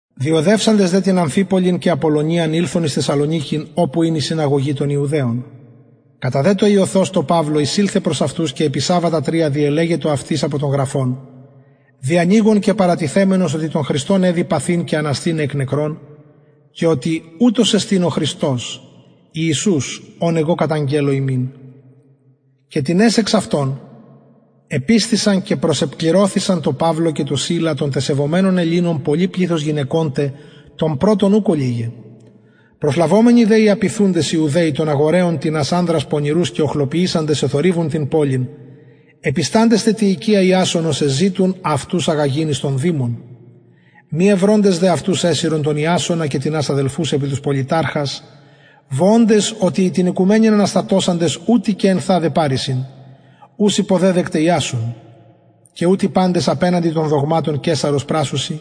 διοδευσαντες δε την αμφιπολιν και απολλωνιαν ηλθον εις θεσσαλονικην οπου ην η συναγωγη των ιουδαιων κατα δε το ειωθος τω παυλω εισηλθεν προς αυτους και επι σαββατα τρια διελεξατο αυτοις απο των γραφων διανοιγων και παρατιθεμενος οτι τον χριστον εδει παθειν και αναστηναι εκ νεκρων και οτι ουτος εστιν ο χριστος ιησους ον εγω καταγγελλω υμιν και τινες εξ αυτων επεισθησαν και προσεκληρωθησαν τω παυλω και τω σιλα των τε σεβομενων ελληνων πολυ πληθος γυναικων τε των πρωτων ουκ ολιγαι προσλαβομενοι δε οι ιουδαιοι οι απειθουντες των αγοραιων τινας ανδρας πονηρους και οχλοποιησαντες εθορυβουν την πολιν επισταντες τε τη οικια ιασονος εζητουν αυτους αγαγειν εις τον δημον μη ευροντες δε αυτους εσυρον τον ιασονα και τινας αδελφους επι τους πολιταρχας βοωντες οτι οι την οικουμενην αναστατωσαντες ουτοι και ενθαδε παρεισιν ους υποδεδεκται ιασων και ουτοι παντες απεναντι των δογματων καισαρος πρασσουσιν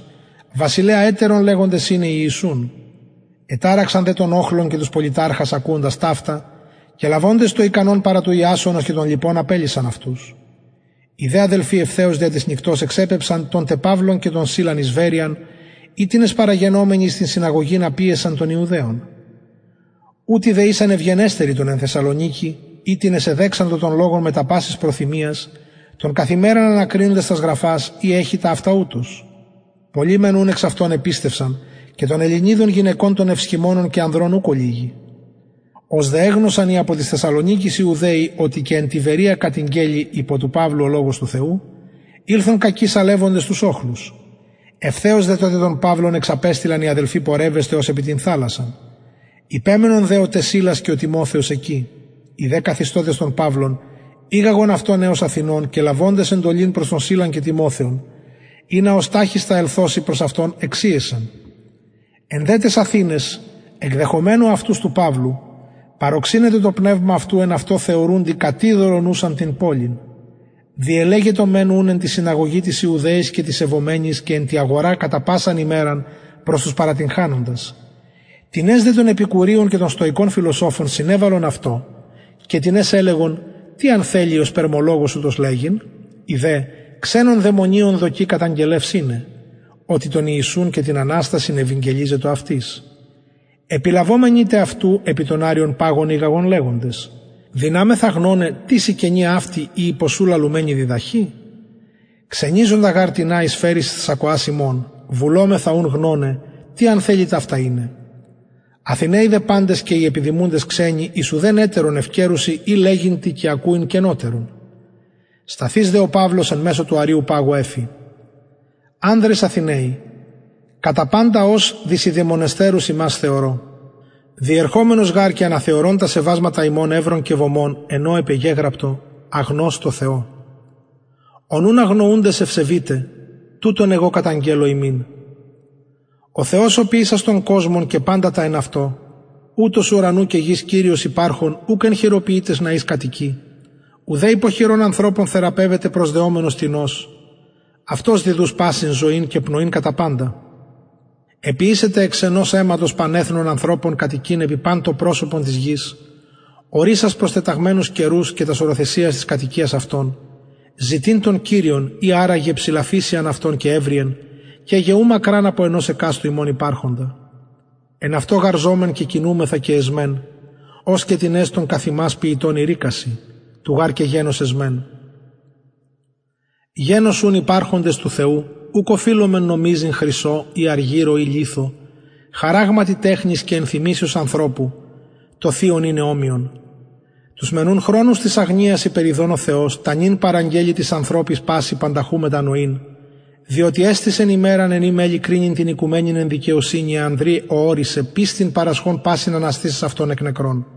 βασιλεα λεγοντες ετερον ειναι ιησουν εταραξαν δε τον οχλον και τους πολιταρχας ακουοντας ταυτα και λαβοντες το ικανον παρα του ιασονος και των λοιπων απελυσαν αυτους οι δε αδελφοι ευθεως δια της νυκτος εξεπεμψαν τον τε παυλον και τον σιλαν εις βεροιαν οιτινες παραγενομενοι εις την συναγωγην απηεσαν των ιουδαιων ουτοι δε ησαν ευγενεστεροι των εν θεσσαλονικη οιτινες εδεξαντο τον λογον μετα πασης προθυμιας το καθ ημεραν ανακρινοντες τας γραφας ει εχοι ταυτα ουτως πολλοι μεν ουν εξ αυτων επιστευσαν και των ελληνιδων γυναικων των ευσχημονων και ανδρων ουκ ολιγοι ως δε εγνωσαν οι απο της θεσσαλονικης ιουδαιοι οτι και εν τη βεροια κατηγγελη υπο του παυλου ο λογος του θεου ηλθον κακει σαλευοντες τους οχλους ευθεως δε τοτε τον παυλον εξαπεστειλαν οι αδελφοι πορευεσθαι ως επι την θαλασσαν υπεμενον δε ο τε σιλας και ο τιμοθεος εκει οι δε καθιστωντες τον παυλον ηγαγον αυτον εως αθηνων και λαβοντες εντολην προς τον σιλαν και τιμοθεον ινα ως ταχιστα ελθωσιν προς αυτον εξηεσαν εν δε ταις αθηναις εκδεχομενου αυτους του παυλου παρωξυνετο το πνευμα αυτου εν αυτω θεωρουντι κατειδωλον ουσαν την πολιν διελεγετο μεν ουν εν τη συναγωγη τοις ιουδαιοις και τοις σεβομενοις και εν τη αγορα κατα πασαν ημεραν προς τους παρατυγχανοντας τινες δε και των επικουρειων και των στοικων φιλοσοφων συνεβαλλον αυτω και τινες ελεγον τι αν θελοι ο σπερμολογος ουτος λεγειν οι δε ξενων δαιμονιων δοκει καταγγελευς ειναι οτι τον ιησουν και την αναστασιν ευηγγελιζετο επιλαβομενοι τε αυτου επι τον αρειον παγον ηγαγον λεγοντες δυναμεθα γνωναι τις η καινη αυτη η υπο σου λαλουμενη διδαχη ξενιζοντα γαρ τινα εισφερεις εις τας ακοας ημων βουλομεθα ουν γνωναι τι αν θελοι ταυτα ειναι αθηναιοι δε παντες και οι επιδημουντες ξενοι εις ουδεν ετερον ευκαιρουν η λεγειν τι και ακουειν καινοτερον σταθεις δε ο παυλος εν μεσω του αρειου παγου εφη ανδρες αθηναιοι κατα παντα ως δεισιδαιμονεστερους υμας θεωρω διερχομενος γαρ και αναθεωρων τα σεβασματα υμων ευρον και βωμον εν ω επεγεγραπτο αγνωστω θεω ον ουν αγνοουντες ευσεβειτε τουτον εγω καταγγελλω υμιν ο θεος ο ποιησας τον κοσμον και παντα τα εν αυτω ουτος ουρανου και γης κυριος υπαρχων ουκ εν χειροποιητοις ναοις κατοικει ουδε υπο χειρων ανθρωπων θεραπευεται προσδεομενος τινος αυτος διδους πασιν ζωην και πνοην κατα παντα εποιησεν τε εξ ενος αιματος παν εθνος ανθρωπων κατοικειν επι παν το προσωπον της γης ορισας προστεταγμενους καιρους και τας οροθεσιας της κατοικιας αυτων ζητειν τον κυριον ει αρα γε ψηλαφησειαν αυτον και ευροιεν και γε ου μακραν απο ενος εκαστου ημων υπαρχοντα εν αυτω γαρ ζωμεν και κινουμεθα και εσμεν ως και τινες των καθ υμας ποιητων ειρηκασιν του γαρ και γενος εσμεν γενος ουν υπαρχοντες του θεου ουκ οφειλομεν νομιζειν χρυσω η αργυρω η λιθω χαραγματι τεχνης και ενθυμησεως ανθρωπου το θειον ειναι ομοιον τους μεν ουν χρονους της αγνοιας υπεριδων ο θεος τα νυν παραγγελλει τοις ανθρωποις πασιν πανταχου μετανοειν διοτι εστησεν ημεραν εν η μελλει κρινειν την οικουμενην εν δικαιοσυνη εν ανδρι ω ωρισεν πιστιν παρασχων πασιν αναστησας αυτον εκ νεκρων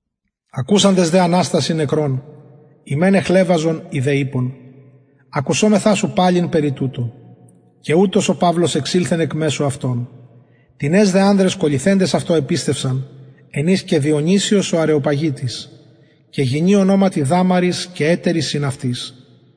ακουσαντες δε αναστασιν νεκρων οι μεν εχλευαζον οι δε ειπον ακουσομεθα σου παλιν περι τουτου και ουτως ο παυλος εξηλθεν εκ μεσου αυτων τινες δε ανδρες κολληθεντες αυτω επιστευσαν εν οις και διονυσιος ο αρεοπαγιτης και γυνη ονοματι δαμαρις και ετεροι συν αυτοις